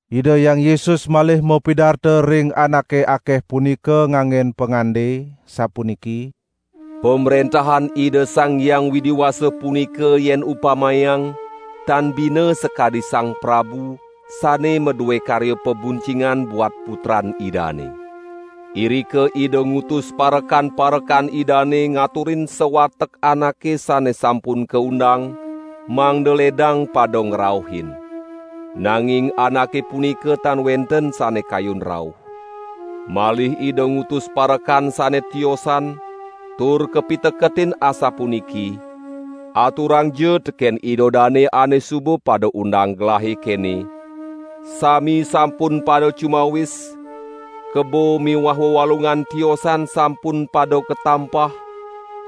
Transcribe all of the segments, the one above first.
Ida Hyang Yesus malih mapidarta ring anake akeh punika nganggen pangande, sapuniki: "Pamrentahan Ida Sang Hyang Widi Wasa punika yen upamayang, tan bina sakadi sang prabu, sane madue karya pabuncingan buat putran idane. Irika ida ngutus parekan-parekan idane ngaturin sawatek anake sane sampun kaundang, mangda ledang pada ngrauhin. Nanging anake punika tan wenten sane kayun rauh. Malih ida ngutus parekan sane tiosan, tur kapiteketin asapuniki: 'Aturangja teken ida dane ane suba pada undang gelahe, kene: Sami sampun pada cumawis, kebo miwah wewalungan tiosan sampun pada katampah,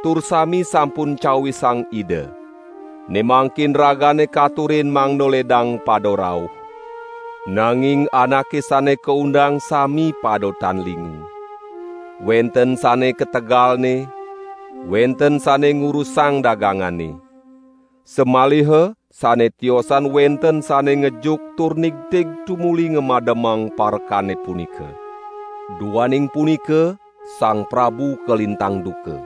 tur sami sampun cawisang ida. Ne mangkin ragane katurin mangda ledang pada rauh.' Nanging anake sane kaundang sami pada tan lingu. Wenten sane ka tegalne, wenten sane ngurusang dagangane. Samaliha sane tiosan wenten sane ngejuk tur nigtig tumuli ngamademang parekane punika. Duaning punika, sang prabu kalintang duka.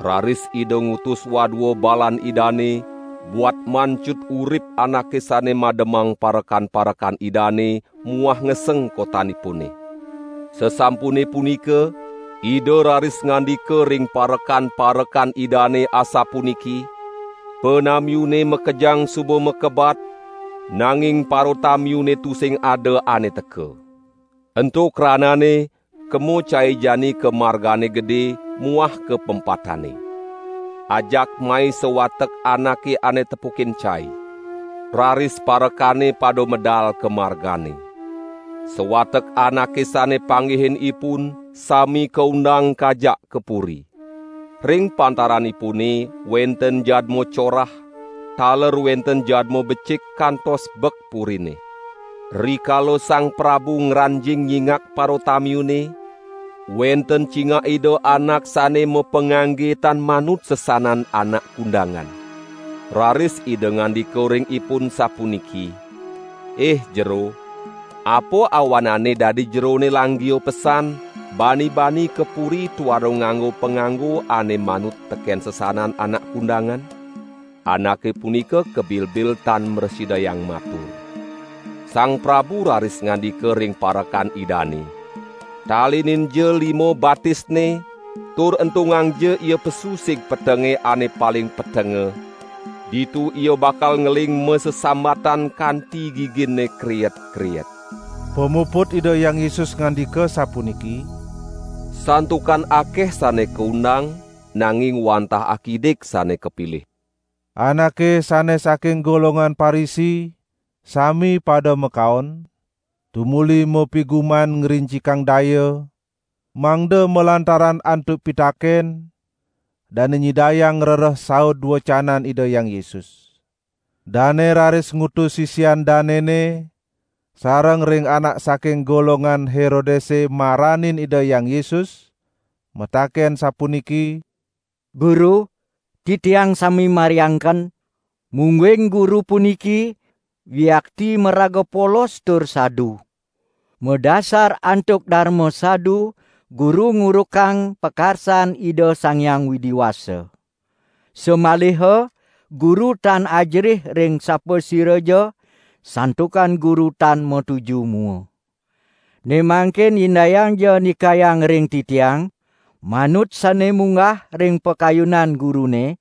Raris ida ngutus wadua balan idane buat mancut urip anake sane mademang parekan-parekan idane miwah ngeseng kotanipune. Sasampune punika, ida raris ngandika ring parekan-parekan idane asapuniki: 'Panamiune makejang suba makebat, nanging paratamiune tusing ada ane teka. Ento kranane kemo cai jani ka margane gede muah ka pempatane. Ajak mai sawatek anake ane tepukin cai.' Raris parekane pada medal ka margane. Sawatek anake sane panggihinipun, sami kaundang kajak ka puri. Ring pantaranipune, wenten jadma corah, taler wenten jadma becik kantos bek purine. Rikala sang prabu ngranjing nyingak paratamiune, wenten cingak ida anak sane mapangangge tan manut sesanan anak kundangan. Raris ida ngandika ring ipun sapuniki: 'Ih jero, apa awanane dadi jerone langgia pesan bani-bani ka puri tuara nganggo panganggo ane manut teken sesanan anak kundangan?' Anake punika kabibil tan mrasidayang matur. Sang Prabu raris ngandika ring parekan idane: 'Talininja lima-batisne tur entungangja ia pesu sig petenge ane paling petenga, ditu ia bakal ngeling masesambatan kanti giginne kriet-kriet.' " Pamuput Ida Hyang Yesus ngandika sapuniki: "Santukan akeh sane kaundang, nanging wantah akidik sane kapilih." Anake sane saking golongan Parisi sami pada makaon, tumuli mapiguman ngrincikang daya, mangda malantaran antuk pitaken, dane nyidayang ngrereh saud wecanan Ida Hyang Yesus. Dane raris ngutus sisian danene sareng ring anak saking golongan Herodese maranin Ida Hyang Yesus, mataken sapuniki: "Guru, titiang sami mariangken, mungguing Guru puniki yuakti maraga polos tur sadu. Madasar antuk darma sadu Guru ngurukang pakarsan Ida Sang Hyang Widi Wasa. Samaliha Guru tan ajerih ring sapasiraja, santukan Guru tan matuju mua. Ne mangkin indayangja ndikayang ring titiang, manut sane munggah ring pakayunan Gurune: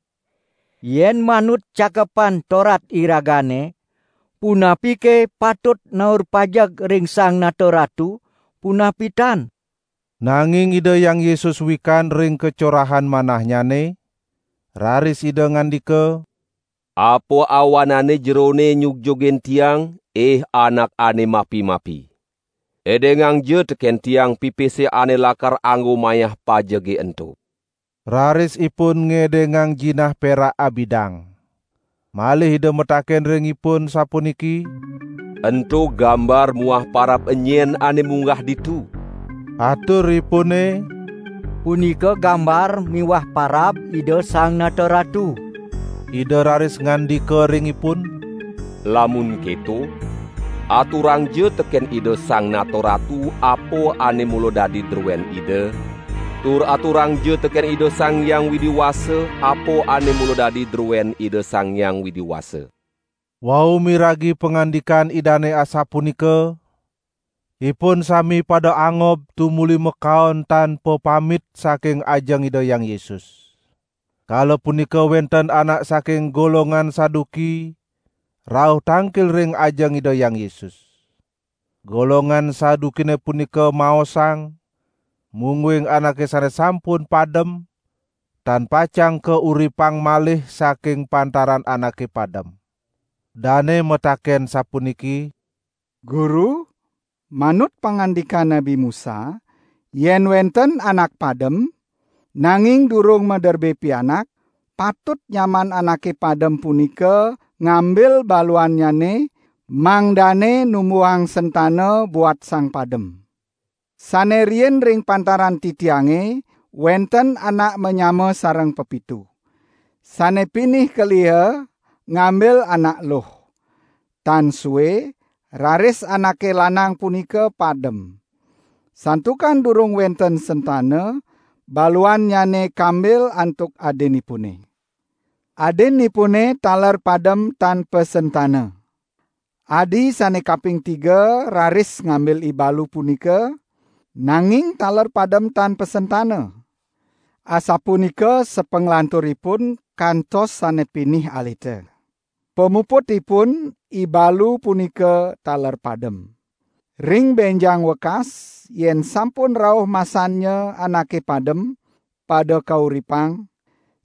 Yen manut Cakepan Torat iragane, punapike patut naur pajeg ring Sang Nata Ratu, punapi tan?" Nanging Ida Hyang Yesus wikan ring kacorahan manahnyane, raris Ida ngandika: "Apa awanane jerone nyugjugin Tiang, ih anak ane mapi-mapi. Edengangja teken Tiang pipise ane lakar anggo mayah pajege ento!" Raris ipun ngedengang jinah perak abidang. Malih ida mataken ring ipun sapuniki: "Ento gambar muah parab enyen ane munggah ditu?" Aturipune: "Punika gambar miwah parab Ida Sang Nata Ratu." Ida raris ngandika ring ipun: "Lamun keto, aturangja teken Ida Sang Nata Ratu apa ane mula dadi druen ida, tur aturangja teken Ida Sang Hyang Widi Wasa, apa ane mula dadi druen Ida Sang Hyang Widi Wasa!" Wau miragi pangandikan Idane asapunika, ipun sami pada angob tumuli makaon tan papamit saking ajeng Ida Hyang Yesus. Kala punika wenten anak saking golongan Saduki rauh tangkil ring ajeng Ida Hyang Yesus. (Golongan Sadukine punika maosang, mungguing anake sane sampun padem, tan pacang kauripang malih saking pantaran anake padem.) Dane mataken sapuniki: "Guru, manut pangandikan Nabi Musa, yen wenten anak padem, nanging durung maderbe pianak, patut nyaman anake padem punika ngambil baluannyane mangdane numbuhang sentana buat sang padem. Sane riin ring pantaran titiange wenten anak manyama sareng pepitu. Sane pinih keliha ngambil anak eluh. Tan sue, raris anake lanang punika padem. Santukan durung wenten sentana, baluannyane kambil antuk adinipune. Adinipune taler padem tan pasentana. Adi sane kaping tiga raris ngambil ibalu punika, nanging taler padem tan pasentana. Asapunika sapanglanturipun kantos sane pinih alita. Pamuputipun ibalu punika taler padem. Ring benjang wekas, yen sampun rauh masannya anake padem pada kauripang,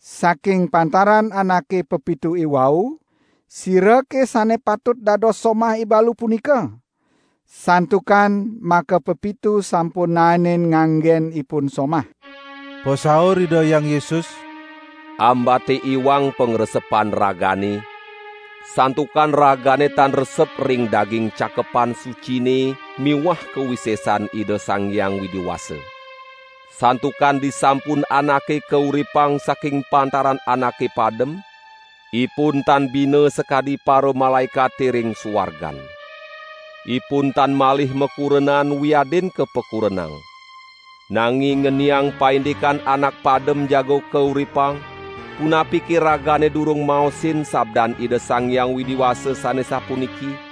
saking pantaran anake pepitu iwau, sirake sane patut dados somah ibalu punika? Santukan makapepitu sampun naenin nganggen ipun somah?" Pasaur Ida Hyang Yesus: "Ambate iwang pangresepan ragane, santukan ragane tan resep ring daging Cakepan Sucine miwah kawisesan Ida Sang Hyang Widi Wasa! Santukan disampun anake kauripang saking pantaran anake padem, ipun tan bina sakadi paramalaekate ring suargan. Ipun tan malih makurenan wiadin kapakurenang. Nanging ngeniang paindikan anak padem jaga kauripang, punapike ragane durung maosin sabdan Ida Sang Hyang Widi Wasa sane sapuniki: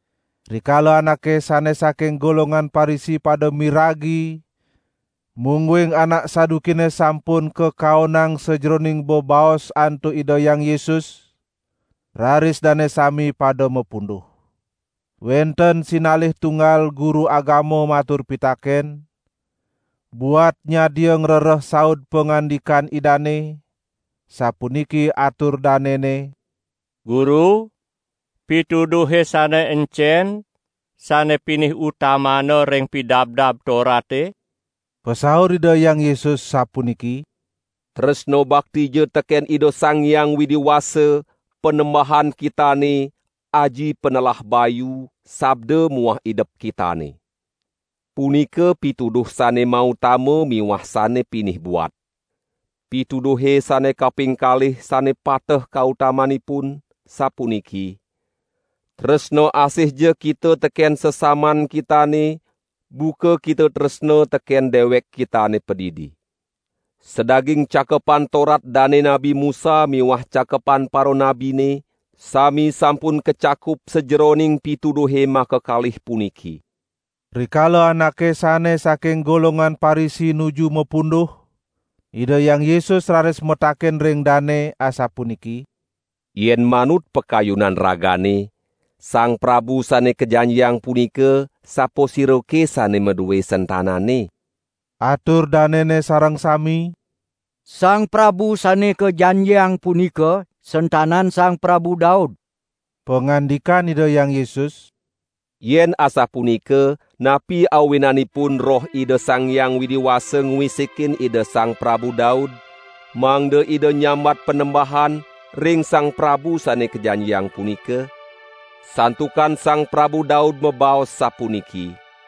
Rikala anake sane saking golongan Parisi pada miragi mungguing anak Sadukine sampun kakaonang sajeroning bebaos antuk Ida Hyang Yesus, raris dane sami pada mapunduh. Wenten sinalih tunggal guru agama matur pitaken, buat nyadia ngrereh saud pangandikan Idane, sapuniki atur danene: "Guru, pituduhe sane encen sane pinih utamana ring Pidabdab Torate?" Pasaur Ida Hyang Yesus, sapuniki: " 'Tresna baktija teken Ida Sang Hyang Widi Wasa, Panembahan kitane, aji panelah bayu, sabda muah idep kitane.' Punika pituduh sane mautama miwah sane pinih buat. Pituduhe sane kaping kalih sane pateh kautamanipun, sapuniki: 'Tresna asihja kita teken sesaman kitane, buka kita tresna teken dewek kitane padidi.' Sadaging Cakepan Torat Dane Nabi Musa miwah cakepan paranabine, sami sampun kacakup sajeroning pituduhe makakalih puniki." Rikala anake sane saking golongan Parisi nuju mapunduh, Ida Hyang Yesus raris mataken ring dane, asapuniki: "Yen manut pakayunan ragane, Sang Prabu Sane Kajanjiang punika, sapasirake sane madue sentanane?" Atur danene sareng sami: "Sang Prabu Sane Kajanjiang punika sentanan Sang Prabu Daud!" Pangandikan Ida Hyang Yesus: "Yen asapunika napi awinanipun Roh Ida Sang Hyang Widi Wasa ngwisikin Ida Sang Prabu Daud, mangda Ida nyambat Panembahan, ring Sang Prabu Sane Kajanjiang punika? Santukan Sang Prabu Daud mabaos sapuniki: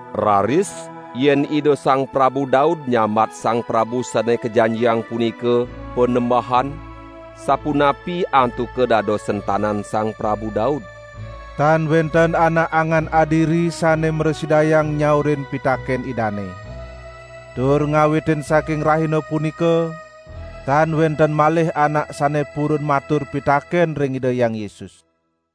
Raris, yen Ida Sang Prabu Daud nyambat Sang Prabu Sane Kajanjiang punika 'Panembahan', sapunapi antuka dados sentanan Sang Prabu Daud?" Tan wenten anak angan adiri sane mrasidayang nyaurin pitaken Idane. Tur ngawitin saking rahina punika tan wenten malih anak sane purun matur pitaken ring Ida Hyang Yesus.